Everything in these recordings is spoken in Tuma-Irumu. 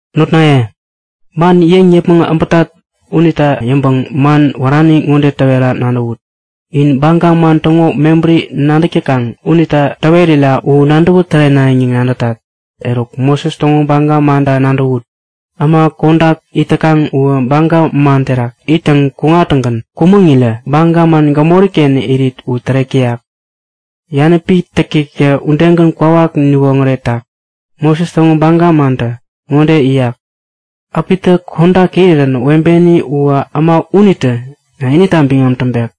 Notnaye, man yäŋ yäpmäŋ äbätat unita yäŋpäŋ man wärani ŋode täwera nadäwut. In baga man täŋo mebäri nadäk täkaŋ unita täwerira u nadäwä tärenayäŋ yäŋ nadätat. Eruk Moses täŋo baga manta nadäwut. Äma kodak it täkaŋ uwä baga man terak ittäŋ kuŋtäŋgän kumäŋirä baga man gämori-ken irit u tärek täyak. Yanäpi täktäktä udegän kwawak niwoŋäretak. Moses täŋo baga mantä ŋode yäyak; Äpitä kodak irirän webeni uwä äma unitä inita biŋam täŋpek.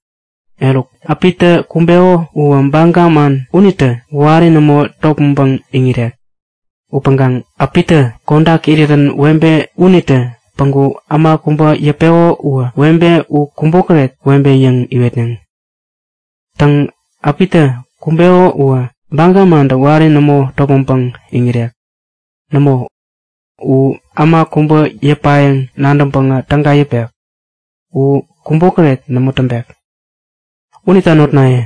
Eruk äpitä kumbeko uwä baga man unitä wari nämo topmäŋpäŋ iŋirek. Upäŋkaŋ äpitä kodak irirän webe unitä päŋku äma kubä yäpeko uwä webe u kubokäret webe yäŋ iwetneŋ. Täŋ, äpitä kumbeko uwä baga mantä wari nämo topmäŋpäŋ iŋirek. Nämo, u äma kubä yäpayäŋ nadäŋpäŋä täga yäpek. U kubokäret nämo täŋpek. Unita notnaye,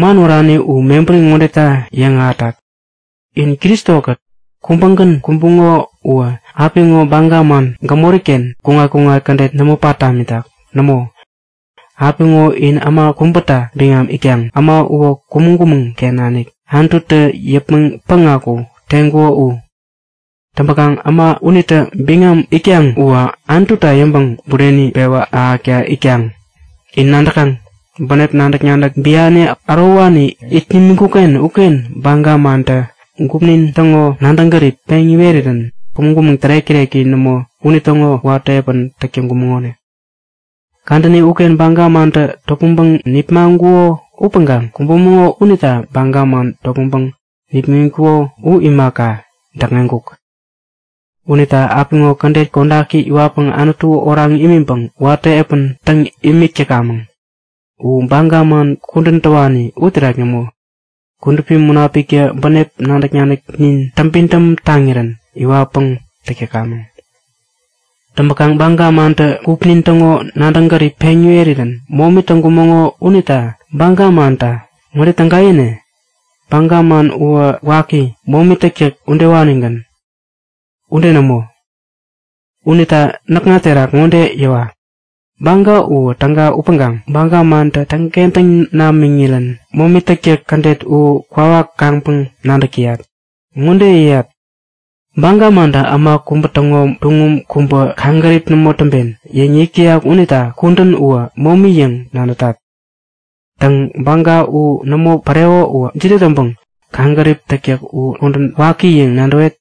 man wärani u mebäri ŋodeta yäŋahätat; In Kristo-kät kubägän kumbuŋo uwä apiŋo baga man gämori-ken kuŋat-kuŋat kädet nämo pat tamitak. Nämo, apiŋo in äma kubäta biŋam itkaŋ. Äma uwä kumäŋ-kumäŋ-ken nanik Anututä yäpmäŋ päŋaku teŋkuko u. Täŋpäkaŋ äma unita biŋam itkaŋ uwä Anututa yäŋpäŋ bureni pewä ahäkta itkaŋ. In nadäkaŋ; Bänep nadäk-nadäk biani ärowani it nimiŋkuk-ken uken baga mantä gupnin täŋo nadäŋ gärip peŋ iwerirän kumäŋ-kumäŋ tärek-täreki nämo unitäŋo watä epän täk täŋkumäŋonik. Kadäni uken baga mantä topmäŋpäŋ nipmaŋkuko upäŋkaŋ kumbumäŋo unita baga man topmäŋpäŋ nipmäŋitkuko u imaka, däkŋeŋkuk. Unita apiŋo kädet kodaki iwatpäŋ Anutu oraŋ imiŋpäŋ watä epän täŋ imik täkamäŋ. U baga man kudän täwani uterak nämo, Kudupi Munapiktä bänep nadäk-nadäknin täŋpidäm taŋirän iwatpäŋ täk täkamäŋ. Täŋpäkaŋ baga mantä gupnin täŋo nadäk-gärip peŋ iwerirän momi täŋkumäŋo unita baga manta ŋode täga yäne? Baga man uwä waki, momi täktäk udewanigän. Ude nämo! Unita näkŋa terak ŋode yäwa; Baga uwä täga upäŋkaŋ baga mantä täŋkentäŋ namiŋirän momi täktäk kädet u kwawak kaŋpäŋ nadäk täyat. Ŋodeta yäyat; Baga mantä Äma kubä täŋo tuŋum kubä kaŋgärip nämo täŋpen yäŋ yäyak unita kudän uwä momi yäŋ nadätat. Täŋ, baga u nämo pareko uwä jide täŋpäŋ kaŋgärip täktäk u kudän waki yäŋ nadäwet?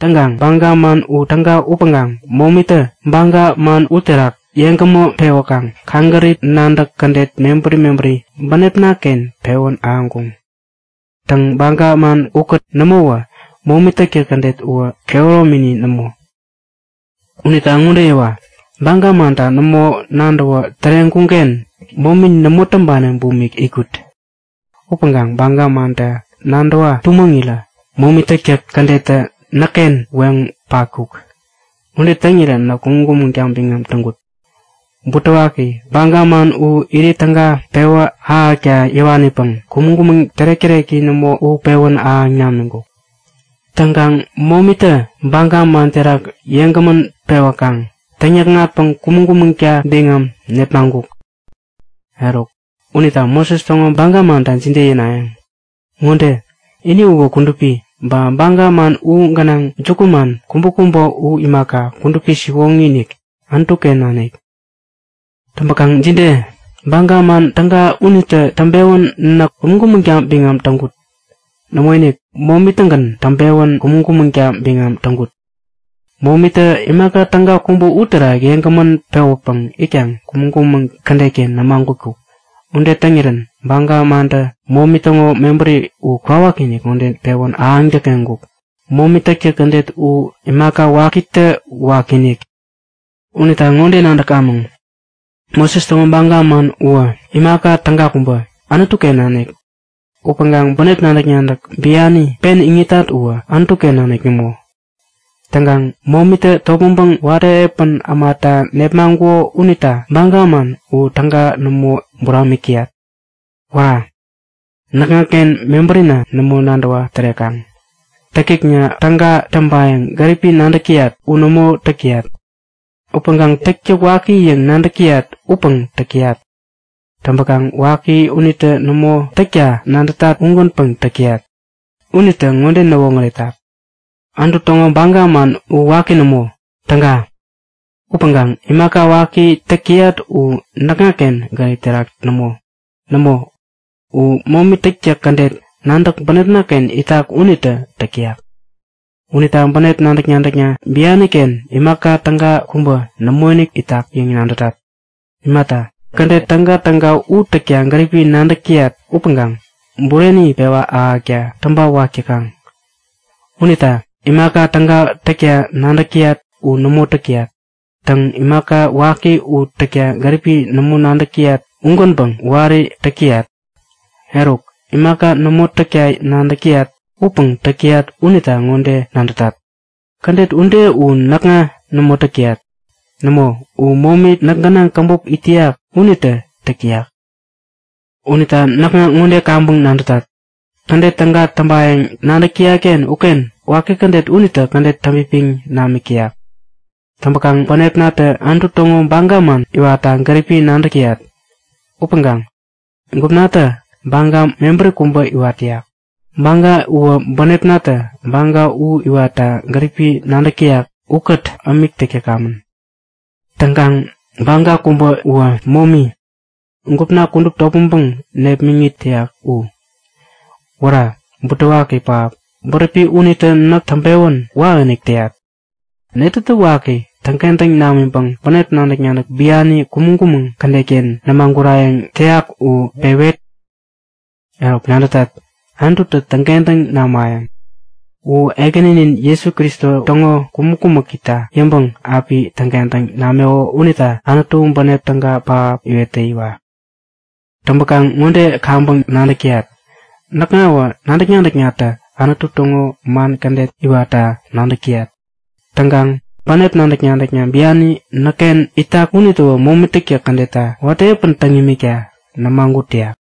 Täŋkaŋ baga man u täga upäŋkaŋ momitä baga man uterak yeŋgämä pewäkaŋ kaŋgärip nadäk kädet mebäri mebäri bänepna-ken pewän ahäŋkuŋ. Täŋ, baga man ukät nämowä momi täktäk kädet uwä kehäromini nämo. Unita ŋode yäwa; Baga manta nämo nadäwa täreŋkuŋ-ken, guŋi, momi nämo täŋpani bumik itkut. Upäŋkaŋ baga manta nadäwa-tumäŋirä momi täktäk kädettä näkken weŋ patkuk. Ude täŋirän näk kumäŋ-kumäŋta biŋam täŋkut. Butewaki, baga man u irit täga pewä ahäkta yäwanipäŋ kumäŋ-kumäŋ tärek-täreki nämo u pewän ahäŋ namiŋkuk. Täŋkaŋ momitä baga man terak yeŋgämän pewäkaŋ täŋ-näkŋatpäŋ kumäŋ-kumäŋta biŋam nepmaŋkuk. Eruk unita Moses täŋo baga manta jide yänayäŋ? Ŋode; Ini uwä kudupi, ba baga man u gänaŋ jukuman kubäkubä u imaka, kudupi siwoŋi-inik, Anutu-ken nanik. Täŋpäkaŋ jide? Baga man täga unitä täŋpewän näk kumäŋ-kumäŋta biŋam täŋkut? Nämoinik, momi-tägän täŋpewän kumäŋ-kumäŋta biŋam täŋkut. Momitä imaka täga kubä uterak yeŋgämän pewäpäŋ itkaŋ kumäŋ-kumäŋ kädet-ken nämagutkuk. Ude täŋirän baga mantä momi täŋo mebäri u kwawakinik ŋode pewän ahäŋ däkŋeŋkuk; Momi täktäk kädet u imaka wakitä wakiinik. Unita ŋode nadäkamäŋ; Moses täŋo baga man uwä imaka täga kubä, Anutu-ken nanik. Upäŋkaŋ bänep nadäk-nadäk biani pen iŋitat uwä, Anutu-ken nanik nämo. Täŋkaŋ momitä topmäŋpäŋ watä epän ämanita nepmaŋkuko unita baga man u täga nämo buramik täyat. Wära! Näkŋaken mebärina nämo nadäwa tärekaŋ! Täktäkna täga täŋpayäŋ gäripi nadäk täyat u nämo täk täyat. Upäŋkaŋ täktäk waki yäŋ nadäk täyat upäŋ täk täyat! Täŋpäkaŋ waki unita nämo täkta nadätat ugänpäŋ täk täyat unitä ŋode näwoŋäretak; Anutu täŋo baga man u waki nämo, täga. Upäŋkaŋ imaka waki täk täyat u näkŋaken gärip terak nämo. Nämo, u momi täktäk kädet nadäk bänepna-ken itak unitä täk täyak. Unita bänep nadäk-nadäkna bianken imaka täga kubä nämoinik itak yäŋ nadätat. Imata, kädet tägatäga u täkta gäripi nadäk täyat upäŋkaŋ bureni pewä ahäkta täŋpawak täkaŋ. Unita imaka täga täkta nadäk täyat u nämo täk täyat. Täŋ, imaka waki u täkta gäripi nämo nadäk täyat, ugänpäŋ wari täk täyat. Eruk, imaka nämo täkta nadäk täyat upäŋ täk täyat unita ŋode nadätat; Kädet ude u näkŋa nämo täk täyat. Nämo, u momi näk gänaŋ käbop it täyak unitä täk täyak. Unita näkŋa ŋode kaŋpäŋ nadätat; Kädet täga täŋpayäŋ nadäk täyat-ken uken waki kädet unitä kädet täŋpipiŋ namik täyak. Täŋpäkaŋ bänepnatä Anutu täŋo baga man iwatta gäripi nadäk täyat. Upäŋkaŋ gupnatä baga mebäri kubä iwat täyak. Baga uwä bänepnatä baga u iwatta gärip nadäk täyak ukät ämik täk täkamän. Täŋkaŋ baga kubä uwä momi, gupna kudup topmäŋpäŋ nepmäŋit täyak u. Wära, butewaki pähap! Bäräpi unitä näk täŋpewän wakinik täyat. Netätä waki täŋkentäŋ namänpäŋ bänep nadäk-nadäk biani kumäŋ-kumäŋ kädet-ken nämagurayäŋ täyak u pewet? Eruk nadätat! Anututä täŋkentäŋ namayäŋ. U Ekäninin Jesu Kristo täŋo kumäk-kumäkita yäŋpäŋ api täŋkentäŋ nameko unita Anutu bänep täga pähap iwet täyiwa! Täŋpäkaŋ ŋode kaŋpäŋ nadäk täyat; Näkŋawä nadäk-nadäknatä Anutu täŋo man kädet iwatta nadäk täyat. Täŋkaŋ bänep nadäk-nadäk biani näkken itak unitäwä momi täktäk kädetta watä epän täŋ imikta nämagut täyak.